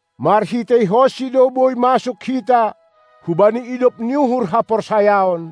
MarhiteihonSi do boi masuk hita hubani idop ni uhur haporsayaon,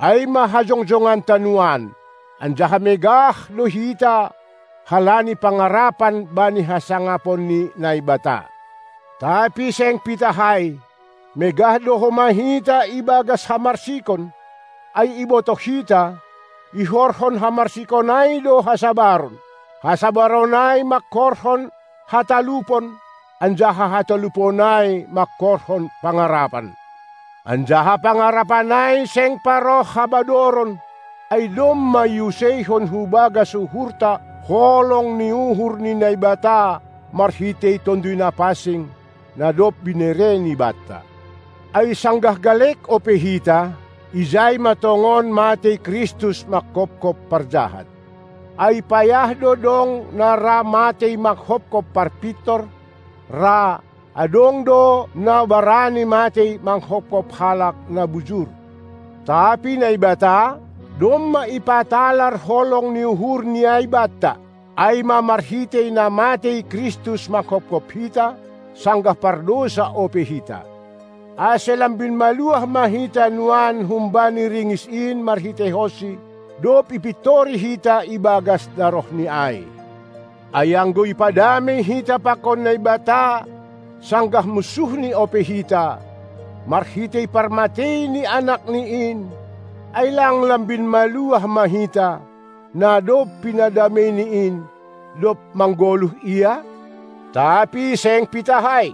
ai ma hajongjonganta nuan, anjaha megah do hita halani pangarapan bani hasangapon ni Naibata. Tapi seng pitah ai, megah do homa hita ibagas hamarsikon, ai ibotoh hita, ihorhon hamarsikon ai do hasabaron; hasabaron ai mangkorhon hatalupon, anjaha hatalupon ai mangkorhon pangarapan. Anjaha pangarapan ai seng paroh habadoron, ai domma iuseihon hubagas uhurta holong ni uhur ni Naibata marhitei Tonduy Napansing, na dob binereNi banta. Ai sanggah galek ope hita, ijai ma tongon matei Kristus manghopkop parjahat. Ai payah do dong na ra matei manghopkop parpintor; ra, adong do na barani matei manghopkop halak na bujur. Tapi Naibata, domma ipatalar holong ni uhurNi ai banta, ai ma marhitei na matei Kristus manghopkop hita, sanggah pardousa ope hita. Ase lambin maluah ma hita nuan humbani ringis in marhiteihonSi, dob ipintori hita ibagas darohNi ai. Ai anggo ipadamei hita pakon Naibata sanggah munsuhNi ope hita, marhitei parmatei ni Anakni in, ai lang lambin maluah ma hita, na dob pinadameiNi in, dob manggoluh Ia? Tapi seng pitah ai,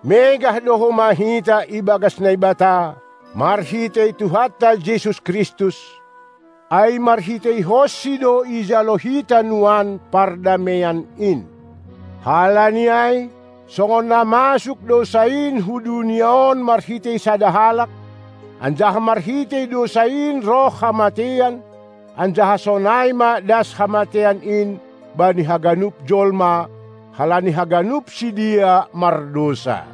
megah do homa hita ibagas Naibata, marhitei Tuhanta Jesus Kristus, ai marhiteihonSi do ijalo hita nuan pardameian in. Halani ai, songon na masuk dousa in hu dunia on marhitei sada halak, anjaha marhitei dousa in roh hamateian, anjaha sonai ma das hamateian in bani haganup jolma, halani haganup sidea mardousa.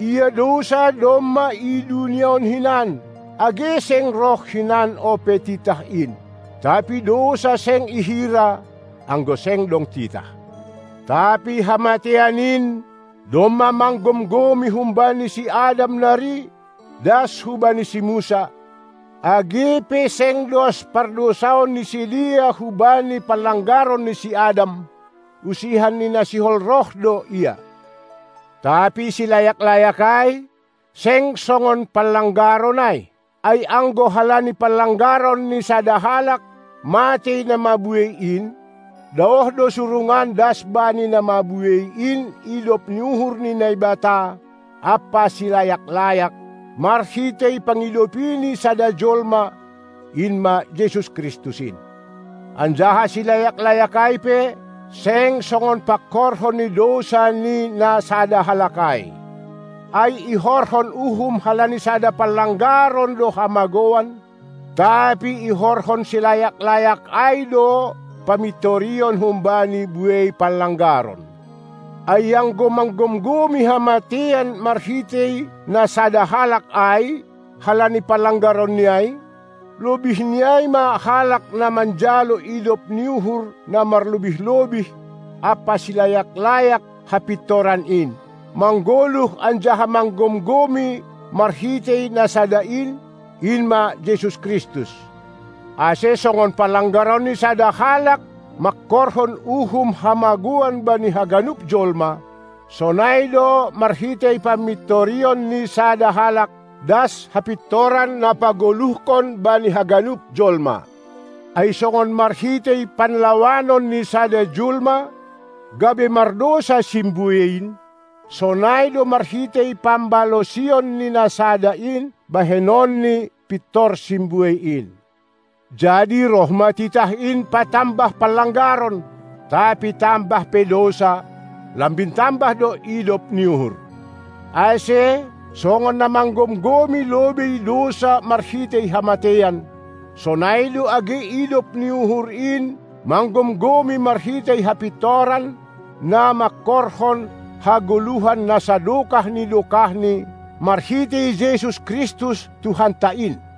Ia dousa domma i dunia on hinan, age seng roh hinan ope titah in, tapi dousa seng ihira, anggo seng dong titah. Tapi hamateian in domma manggomgomi humbani si Adam nari das hubani si Musa, age pe seng dos pardousaon ni sidea hubani panlanggaron ni si Adam; usihan ni na sihol roh do ia. Tapi silayak-layak ai seng songon panlanggaron ai. Ai anggo halani panlanggaron ni sada halak matei na mabuei in, daoh do surungan das bani na mabuei in idop ni uhur ni Naibata ampa silayak-layak, marhitei pangidopi ni sada jolma, in ma Jesus Kristus in. Anjaha silayak-layak ai pe seng songon pangkorhon ni dousa ni na sada halak ai. Ai ihorhon uhum halani sada panlanggaron do hamagouan, tapi ihorhon silayak-layak ai do pamintorion humbani buei panlanggaron. Ai anggo manggomgomi hamateian marhitei na sada halak ai halani panlanggaronni ai, lobihni ai ma halak na manjalo idop ni uhur na marlobih-lobih ampa silayak-layak hapintoran in, manggoluh anjaha manggomgomi marhitei na sada in, in ma Jesus Kristus. Ase songon panlanggaron ni sada halak mangkorhon uhum hamagouan bani haganup jolma, sonai do marhitei pamintorion ni sada halak das hapintoran na pagoluhkon bani haganup jolma. Ai songon marhitei panlawanon ni sada jolma gabe mardousa simbuei in, sonai do marhitei pambalosion ni na Sada in bahenonni pintor simbuei in. Jadi roh ma titah in patambah panlanggaron; tapi tambah pe dousa, lambin tambah do idop ni uhur. Ase, songon na manggomgomi lobei dousa marhitei hamateian, sonai do age idop ni uhur in manggomgomi marhitei hapintoran na mangkorhon hagoluhan na sadokah ni dokahni marhitei Jesus Kristus Tuhanta in.